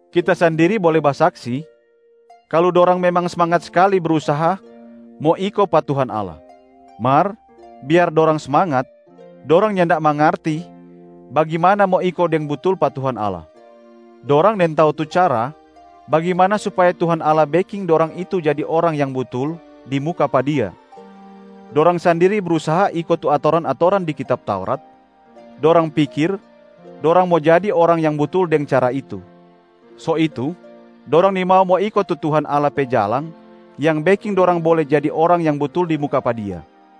Kita sandiri bole basaksi kalu dorang memang smangat skali brusaha mo iko pa Tuhan Allah. Mar biar dorang smangat, dorang nyanda mangarti bagimana mo iko deng butul pa Tuhan Allah. Dorang nintau tu cara bagimana supaya Tuhan Allah beking dorang itu jadi orang yang butul di muka pa Dia. Dorang sandiri brusaha iko tu atoran-atoran di kitab Taurat, dorang pikir dorang mo jadi orang yang butul deng cara itu. So itu, dorang nimau mo iko tu Tuhan Allah pe jalang yang beking dorang bole jadi orang yang butul di muka pa Dia.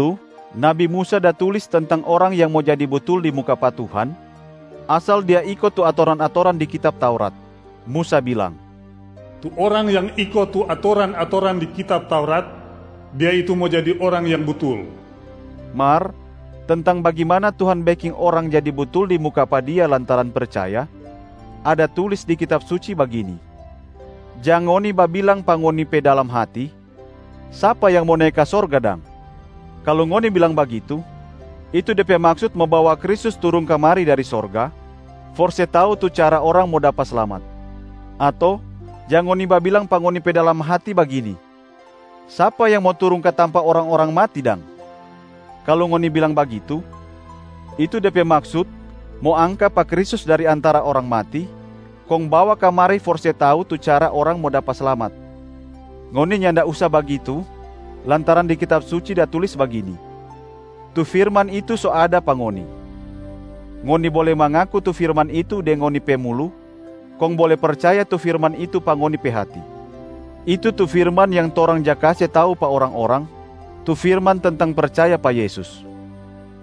Dulu nabi Musa da tulis tentang orang yang mo jadi butul di muka pa Tuhan asal dia iko tu atoran-atoran di kitab Taurat, Musa bilang: “Tu orang yang iko tu atoran-atoran di kitab Taurat, dia itu mo jadi orang yang butul.” Mar tentang bagimana Tuhan beking orang jadi butul di muka pa Dia lantaran percaya, ada tulis di Kitab Suci bagini, “Jang ngoni babilang pa ngoni pe dalam hati, ‘Sapa yang mo nae ka sorga dang?’” kalu ngoni bilang bagitu, itu de pe maksut mo bawa Kristus turung kamari dari sorga for se tau tu cara orang mo dapa slamat. Ato jang ngoni babilang pa ngoni pe dalam hati bagini, ‘Sapa yang mo turung ka tampa orang-orang mati dang?’ kalu ngoni bilang bagitu, itu de pe maksut mo angka pa Kristus dari antara orang mati kong bawa kamari for se tau tu cara orang mo dapa slamat. Ngoni nyanda usa bagitu lantaran di Kitab Suci da tulis bagini, “Tu firman itu so ada pa ngoni. Ngoni bole mangaku tu firman itu deng ngoni pe mulu, kong bole percaya tu firman itu pa ngoni pe hati.” Itu tu firman yang torang ja kase tau pa orang-orang, tu firman tentang percaya pa Yesus.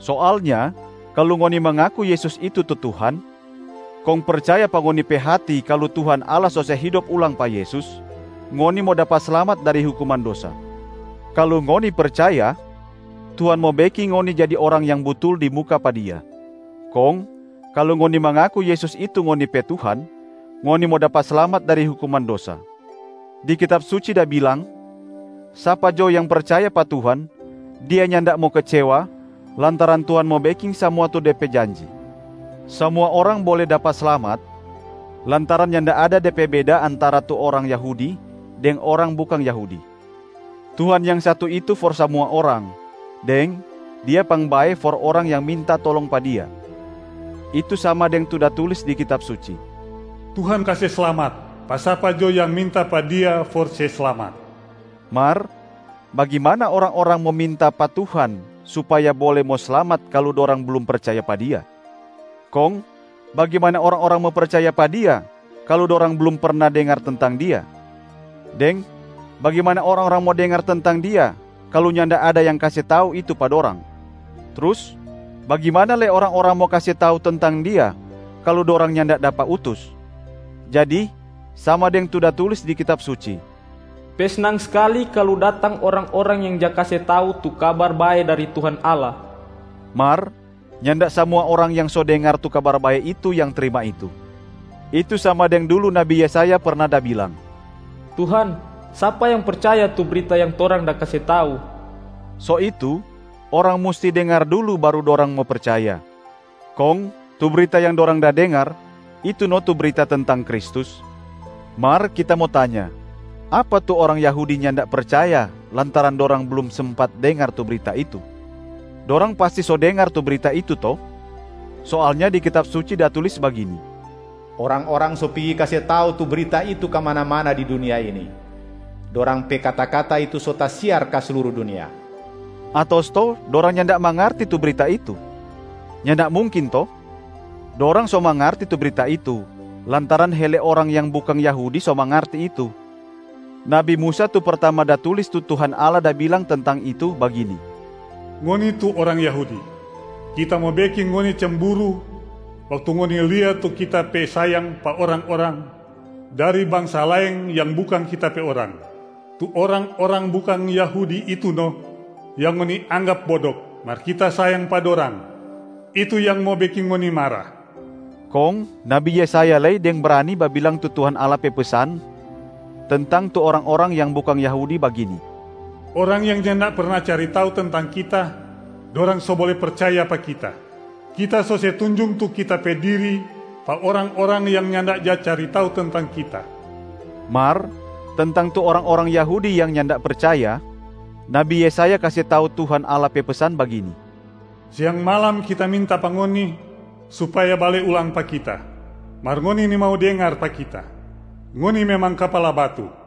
Soalnya kalu ngoni mangaku Yesus itu tu Tuhan, kong percaya pa ngoni pe hati kalu Tuhan Allah so se hidop ulang pa Yesus, ngoni mo dapa slamat dari hukuman dosa. Kalu ngoni percaya, Tuhan mo beking ngoni jadi orang yang butul di muka pa Dia. Kong kalu ngoni mangaku Yesus itu ngoni pe Tuhan, ngoni mo dapa slamat dari hukuman dosa. Di Kitab Suci da bilang, “Sapa jo yang percaya pa Tuhan, dia nyanda mo kecewa lantaran Tuhan mo beking samua tu De pe janji.” Samua orang bole dapa slamat lantaran nyanda ada de pe beda antara tu orang Yahudi deng orang bukang Yahudi. Tuhan yang satu itu for samua orang, deng Dia pangbae for orang yang minta tolong pa Dia. Itu sama deng tu da tulis di Kitab Suci, “Tuhan kase slamat pa sapa jo yang minta pa Dia for se slamat.” Mar bagimana orang-orang mo minta pa Tuhan supaya bole mo slamat kalu dorang blum percaya pa Dia? Kong bagimana orang-orang mo percaya pa Dia kalu dorang blum perna dengar tentang Dia? Deng bagimana orang-orang mo dengar tentang Dia kalu nyanda ada yang kase tau itu pa dorang? Trus bagimana lei orang-orang mo kase tau tentang Dia kalu dorang nyanda dapa utus? Jadi sama deng tu da tulis di Kitab Suci, “Pe snang skali kalu datang orang-orang yang ja kase tau tu Kabar Bae dari Tuhan Allah.” Mar nyanda samua orang yang so dengar tu Kabar Bae itu yang trima itu. Itu sama deng dulu Nabi Yesaya perna da bilang, “Tuhan, sapa yang percaya tu brita yang torang da kase tau?” So itu, orang musti dengar dulu baru dorang mo percaya, kong tu brita yang dorang da dengar itu no tu brita tentang Kristus. Mar kita mo tanya, apa tu orang Yahudi nyanda percaya lantaran dorang blum sempat dengar tu brita itu? Dorang pasti so dengar tu brita itu to? Soalnya di Kitab Suci da tulis bagini, “Orang-orang so pigi kase tau tu brita itu kamana-mana di dunia ini, dorang pe kata-kata itu so tasiar ka sluru dunia.” Ato stou dorang nyanda mangarti tu brita itu? Nyanda mungkin to? Dorang so mangarti tu brita itu, lantaran hele orang yang bukang Yahudi so mangarti itu. Nabi Musa tu pertama da tulis tu Tuhan Allah da bilang tentang itu, bagini, “Ngoni tu orang Yahudi, Kita mo beking ngoni cemburu waktu ngoni lia tu Kita pe sayang pa orang-orang dari bangsa laeng yang bukang Kita pe orang. Tu orang-orang bukang Yahudi itu no yang ngoni anggap bodok, mar Kita sayang pa dorang. Itu yang mo beking ngoni mara.” Kong Nabi Yesaya lei deng brani babilang tu Tuhan Allah pe pesan tentang tu orang-orang yang bukang Yahudi bagini, “Orang yang nyanda perna cari tau tentang Kita, dorang so bole percaya pa Kita. Kita so se tunjung tu Kita pe diri pa orang-orang yang nyanda ja cari tau tentang Kita.” Mar tentang tu orang-orang Yahudi yang nyanda percaya, Nabi Yesaya kase tau Tuhan Allah pe pesan bagini, “Siang malam Kita minta pa ngoni supaya bale ulang pa Kita, mar ngoni nimau dengar pa Kita, ngoni memang kapala batu.”